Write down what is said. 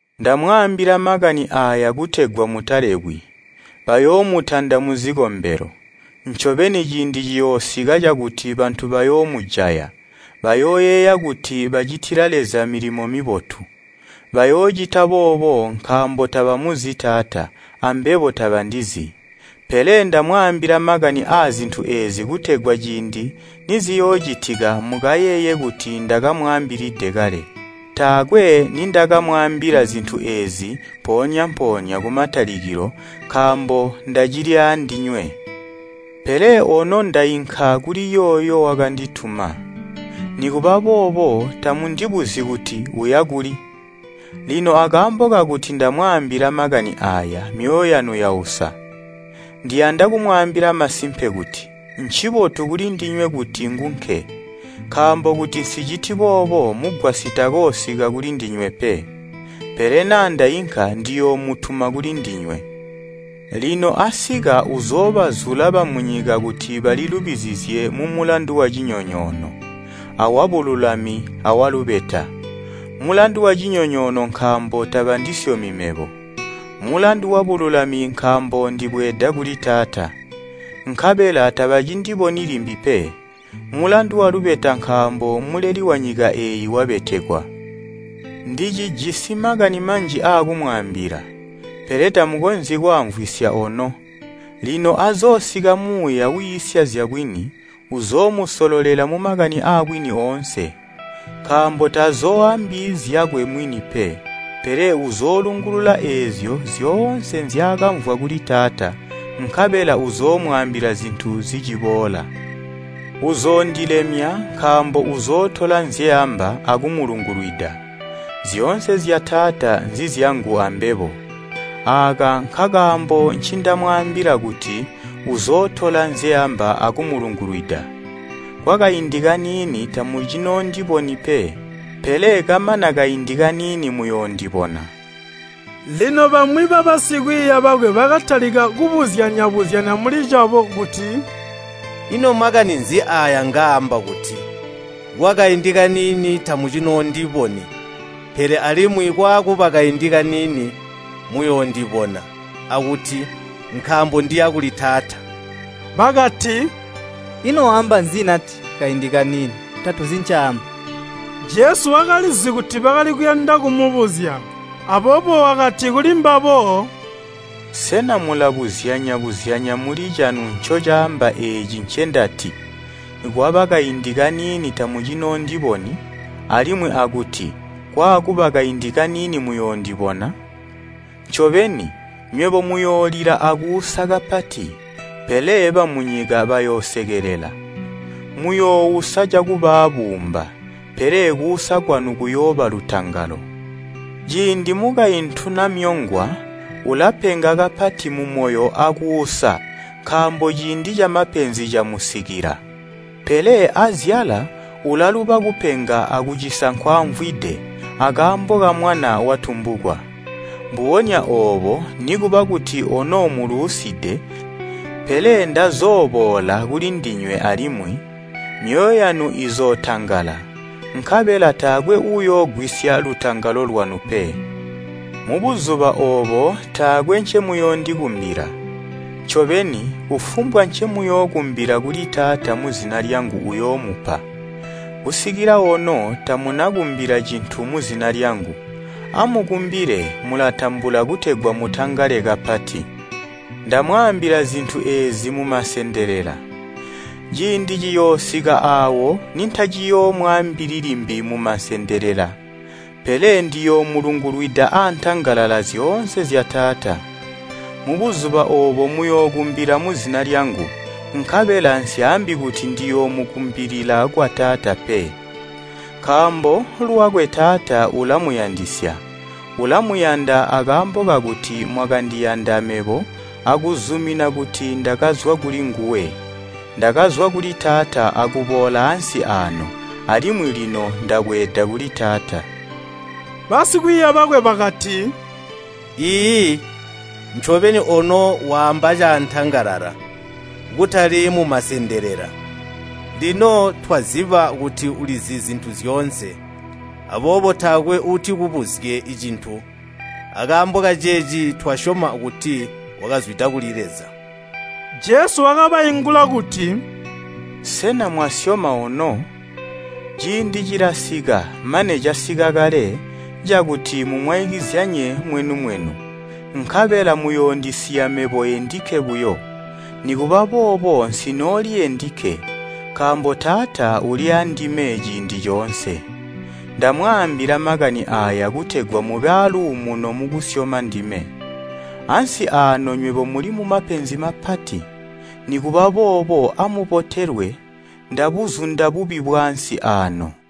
“Ndamwaambila makani aaya kutegwa mutalebwi. Bayoomutanda muzikombelo. Ncobeni ciindi ciyoosika cakuti bantu bayoomujaya, bayooyeeya kuti bacitila Leza milimo mibotu. Bayoocita boobo nkaambo tabamuzi Taata, ambebo tabandizi. Pele ndamwaambila makani aazintu eezi kutegwa ciindi niziyoocitika mukayeeye kuti ndakamwaambilide kale. Zya milimo ya Muuya Uusalala “Taakwe nindakamwaambila zintu eezi mpoonya-mpoonya kumatalikilo nkaambo ndacili aandinywe. Pele ono ndainka kuli yooyo wakandituma, nikuba boobo tamundibuzyi kuti ‘Uya kuli?’ Lino akaambo kakuti ndamwaambila makani aaya, myoyo yanu yausa. Ndiyanda kumwaambila masimpe kuti, ncibotu kulindinywe kuti ngunke. Nkaambo kuti nsiciti boobo Mugwasyi takoosika kulindinywe pe. Pele naa ndainka ndiyoomutuma kulindinywe. Lino asika uzoobazula bamunyika kuti balilubizizye mumulandu wacinyonyoono, awabululami awalubeta. Mulandu wacinyonyoono nkaambo tabandisyomi mebo. Mulandu wabululami nkaambo ndibweeda kuli Taata, nkabela tabacindiboni limbi pe. Mulandu walubeta nkaambo muleli wanyika eeyi wabetekwa. “Ndicijisi makani manji aakumwaambila, pele tamukonzyi kwaamvwisya ono. Lino azoosika Muuya wiisya zyabwini, uzoomusololela mumakani aabwini oonse. Nkaambo tazooambi zyakwe mwini pe, pele uzoolungulula eezyo zyoonse nzyaakamvwa kuli Taata, nkabela uzoomwaambila zintu ziciboola. Uzoondilemya nkaambo uzootola nzyeamba akumulungulwida. Zyoonse zya Taata nzizyangu ambebo, aaka nkakaambo ncindamwaambila kuti uzootola nzyeamba akumulungulwida. “Kwakaindi kaniini tamucinoondiboni pe, pele kamana kaindi kaniini muyoondibona.” Lino bamwi babasikwiiya bakwe bakatalika kubuzyanya-buzyanya mulicabo kuti, “Ino makani nzi aaya ngaamba kuti, ‘Kwakaindi kaniini tamucinoondiboni, pele alimwi kwaakuba kaindi kaniini muyoondibona,’ akuti, ‘Nkaambo ndiya kuli Taata?’” Bakati, “Ino waamba nzi nati, ‘Kaindi kaniini?’ Tatuzi ncaamba.” Jesu wakalizi kuti bakali kuyanda kumubuzya, aboobo wakati kulimbabo, “Sena mulabuzyanya-buzyanya mulicanu ncocaamba eeci ncendati, ‘Kwaba kaindi kaniini tamucinoondiboni, alimwi akuti kwaakuba kaindi kaniini muyoondibona?’ Ncobeni, nywebo muyoolila akuusa kapati, pele bamunyika bayoosekelela. Muyoousa cakuba aabuumba, pele kuusa kwanu kuyooba lutangalo. Ciindi mukaintu namyongwa ulapenga kapati mumoyo akuusa nkaambo ciindi camapenzi camusikila. Pele azyala ulaluba kupenga akucisa nkwaamvwide, akaambo kamwana watumbukwa. Mbubonya oobo nikuba kuti ono muluuside, pele ndazooboola kulindinywe alimwi, myoyo yanu izootangala, nkabela taakwe uuyoogwisya lutangalo lwanu pe. Mubuzuba oobo taakwe ncemuyoondikumbila. Ncobeni, kufumbwa ncemuyookumbila kuli Taata muzina lyangu uyoomupa. Kusikila ono tamunakumbila cintu muzina lyangu. Amukumbile, mulatambula kutegwa mutangale kapati. “Ndamwaambila zintu eezi mumasendelela. Ciindi ciyoosika aawo nintaciyoomwaambili limbi mumasendelela, pele ndiyoomulungulwida antangalala zyoonse zya Taata. Mubuzuba oobo muyookumbila muzina lyangu, nkabela nsyaambi kuti ndiyoomukumbilila kwa Taata pe, nkaambo lwakwe Taata ulamuyandisya. Ulamayanda akaambo kakuti mwakandiyanda mebo akuzumina kuti ndakazwa kulinguwe. Ndakazwa kuli Taata akuboola ansi aano, alimwi lino ndabweeda kuli Taata.” Basikwiiya bakwe bakati, “Iiyi, ncobeni ono waamba caantangala, kutali mumasendelela! Lino twaziba kuti ulizi zintu zyoonse, aboobo taakwe uutikubuzye cintu, akaambo kaceeci twasyoma kuti wakazwida kuli Leza.” Jesu wakabaingula kuti, “Sena mwasyoma ono? Ciindi cilasika, mane casika kale, cakuti mumwaikizyanye mwenu-mwenu, nkabela muyoondisiya mebo endikke buyo. Nikuba boobo nsinooli endikke, nkaambo Taata uli aandime ciindi coonse. Ndamwaambila makani aaya kutegwa mube aluumuno mukusyoma ndime. Ansi aano nywebo muli mumapenzi mapati. Nikuba boobo amubotelwe, ndabuzunda bubi bwaansi aano.”